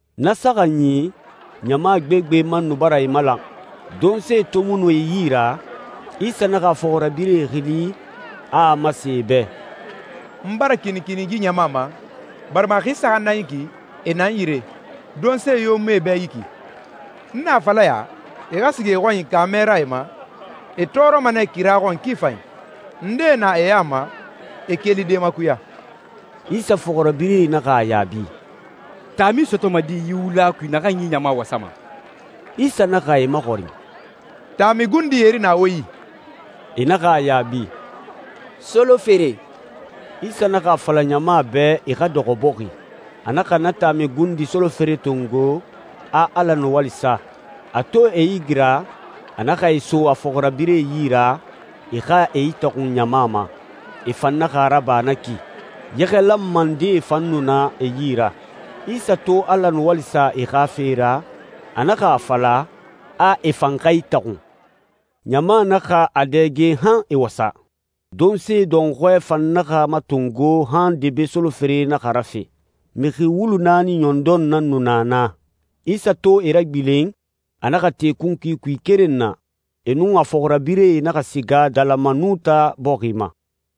Na saxanyi, ɲama gbegbe man nu bara e malan. Donse to mu nu e yi ra, Isa naxa a fɔxirabirɛe xili, a a masen e bɛ, «N bara kinikini yi ɲama ma, barima a xi saxan nan yi ki, e na n yire. Donse yo mu e bɛ yi ki. N na a fala ya, e xa siga e xɔnyi kaamɛ ra e ma, e tɔɔrɔma nɛ kira xɔn ki fanyi. Ndee na e ya ma, e kelide makuya.» Isa fɔxirabirɛe naxa a yaabi, «Taami sɔtɔma di yi wula kui naxan yi ɲama wasama?» Isa naxa e maxɔrin, «Taami gundi yeri na wo yi?» E naxa a yaabi, «Solofere.» Isa naxa a fala ɲama bɛ e xa dɔxɔ bɔxi. A naxa na taami gundi solofere tongo, a Ala nuwali sa. A to e igira, a naxa e so a fɔxirabirɛe yi ra, e xa e itaxun ɲama ma. E fan naxa a raba na ki. Yɛxɛ lanma ndee fan nu na e yi ra. Isa to Ala nuwali sa e xa fe ra, a naxa a fala, a e fan xa itaxun. Ɲama naxa a dɛge han e wasa. Donse dɔnxɔɛ fan naxa matongo han debe solofere naxa rafe. Mixi wulu naani ɲɔndɔn nan nu na naa. Isa to e ragbilen, a naxa te kunkui kui keren na, e nun a fɔxirabirɛe naxa siga Dalamanuta bɔxi ma.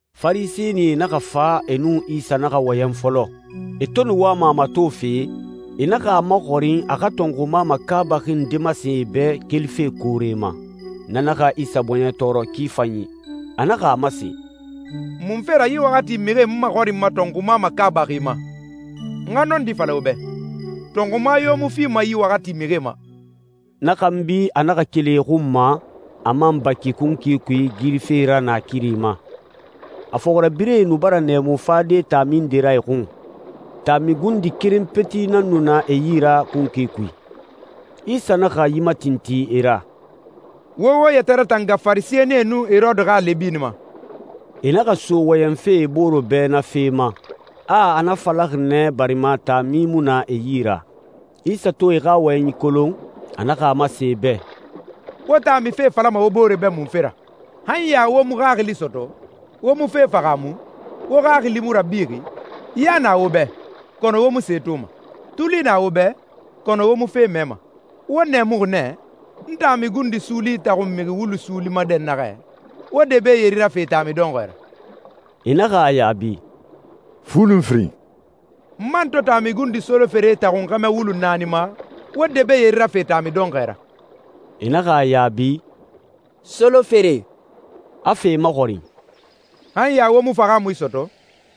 Farisɛnie naxa fa, e nun Isa naxa wɔyɛn fɔlɔ. E to nu wama a matofe, e naxa a maxɔrin a xa tɔnxuma makaabaxi nde masen e bɛ kelife koore ma. Na naxa Isa bɔɲɛ tɔɔrɔ ki fanyi. A naxa a masen, «Munfe ra yi waxati mixie n maxɔrinma tɔnxuma makaabaxi ma? N xa nɔndi fala wo bɛ, tɔnxuma yo mu fima yi waxati mixie ma.» Na xanbi a naxa keli e xun ma, a man baki kunkui kui girife ra naakiri ma. A fɔxirabirɛe nu bara nɛɛmu fade taami nde ra e xun. Taami gundi keren peti nan nu na e yi ra kunkui kui. Isa naxa yi matintin e ra, «Wo wo yɛtɛ ratanga Farisɛnie nun Herode xa lɛbini ma.» E naxa so wɔyɛnfe e bore bɛ na fe ma, a a na falaxi nɛ barima taami mu na e yi ra. Isa to e xa wɔyɛnyi kolon, a naxa a masen e bɛ, «Wo taami fe falama wo bore bɛ munfe ra? Han ya wo mu xaxili sɔtɔ, wo mu fe fahaamu? Wo xaxili mu rabixi? Ya na wo bɛ, kɔnɔ wo mu se toma. Tuli na wo bɛ, kɔnɔ wo mu fe mɛma. Wo nɛɛmuxi nɛ? N taami gundi suuli itaxun mixi wulu suuli ma dɛnnaxɛ, wo debe yeri rafe taami dɔnxɔɛ ra?» E naxa a yaabi, «Fu nun firin.» «N man to taami gundi solofere itaxun xɛmɛ wulu naani ma, wo debe yeri rafe taami dɔnxɔɛ ra?» E naxa a yaabi, «Solofere.» A fa e maxɔrin, «Han ya wo mu fahaamui sɔtɔ?»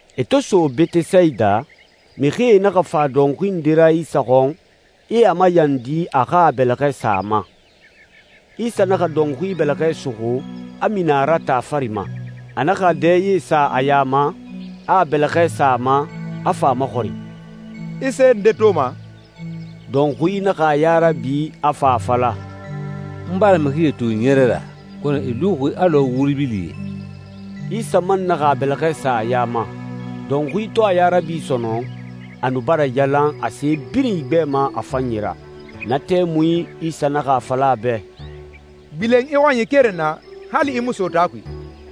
E to so Betesayida, mixie naxa fa dɔnxui nde ra Isa xɔn, e a mayandi a xa a bɛlɛxɛ sa a ma. Isa naxa dɔnxui bɛlɛxɛ suxu, a mini a ra taa fari ma. A naxa a dɛye sa a ya ma, a a bɛlɛxɛ sa a ma, a fa a maxɔrin, «I se nde toma?» Dɔnxui naxa a ya rabi, a fa a fala, «N bara mixie to ɲɛrɛ ra, kɔnɔ e luxi alɔ wuri bilie.» Isa man naxa a bɛlɛxɛ sa a ya ma. Dɔnxui to a ya rabi sɔnɔn, a nu bara yalan, a se birin igbɛma a fanyi ra. Na tɛmui, Isa naxa a fala a bɛ, «Gbilen i xɔnyi keren na, hali i mu so taa kui.»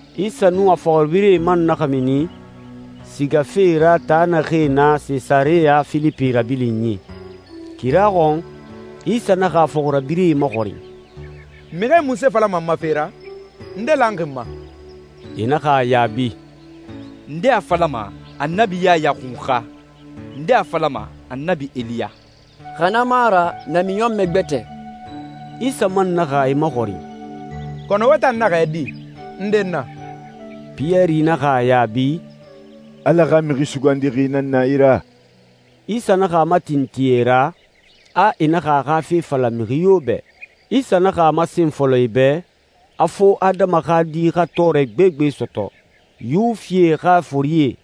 Isa nun a fɔxirabirɛe man naxa mini sigafe ra taa naxee na Sesareya Filipi rabilinyi. Kira xɔn, Isa naxa a fɔxirabirɛe maxɔrin, «Mixie munse falama n ma fe ra? Nde lanxi n ma?» E naxa a yaabi, «Ndee a falama, Annabi Yaya Xunxa. Ndee a falama, Annabi Eliya, xa na mu a ra namiɲɔnmɛ gbɛtɛ.» Isa man naxa e maxɔrin, «Kɔnɔ wo tan naxɛ di? Nde n na?» Piyɛri naxa a yaabi, «Ala xa Mixi Sugandixi nan na i ra.» Isa naxa a matintin e ra, a e naxa a xa fe fala mixi yo bɛ. Isa naxa a masen fɔlɔ e bɛ, a fo Adama xa Di xa tɔɔrɛ gbegbe sɔtɔ. Yuwifie xa forie,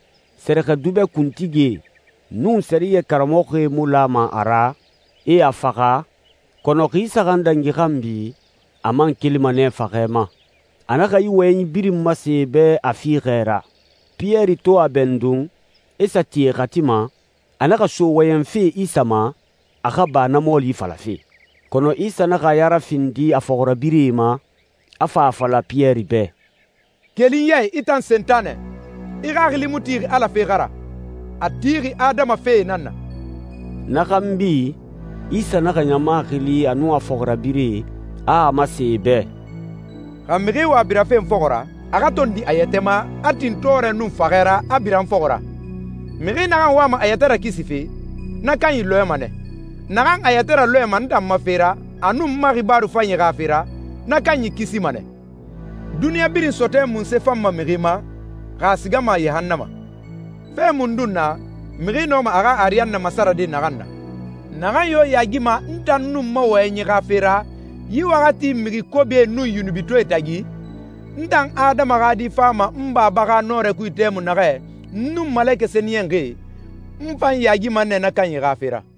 sɛrɛxɛdubɛ kuntigie, nun sɛriyɛ karamɔxɔe mu lama a ra, e a faxa, kɔnɔ xi saxan dangi xanbi, a man kelima nɛ faxɛ ma. A naxa yi wɔyɛnyi birin masen e bɛ a fiixɛ ra. Piyɛri to a bɛndun, e sa ti e xati ma, a naxa so wɔyɛnfe Isa ma, a xa ba na mɔɔli falafe. Kɔnɔ Isa naxa a ya rafindi a fɔxirabirɛe ma, a fa a fala Piyɛri bɛ, «Keli n ya i, i tan Sentanɛ! I xaxili mu tixi Ala fee xa ra, a tixi adama fee nan na.» Na xanbi, Isa naxa ɲama xili a nun a fɔxirabirɛe, a a masen e bɛ, «Xa mixi wa birafe n fɔxɔ ra, a xa tondi a yɛtɛ ma, a tin tɔɔrɛ nun faxɛ ra, a bira n fɔxɔ ra. Mixi naxan wama a yɛtɛ rakisife, na kanyi lɔɛma nɛ. Naxan a yɛtɛ ralɔɛma n tan ma fe ra a nun n ma xibaaru fanyi xa fe ra, na kanyi kisima nɛ. Duniɲa birin sɔtɔɛ munse fanma mixi ma, xa a sigama yahannama? Fe mundun na, mixi nɔma a xa ariyanna masarade naxan na? Naxan yo yaagima n tan nun n ma wɔyɛnyi xa fe ra yi waxati mixi kobie nun yunubitɔɛe tagi, n tan Adama xa Di fama n Baba xa nɔrɛ kui tɛmui naxɛ n nun malekɛ sɛniyɛnxie, n fan yaagima nɛ na kanyi xa fe ra.»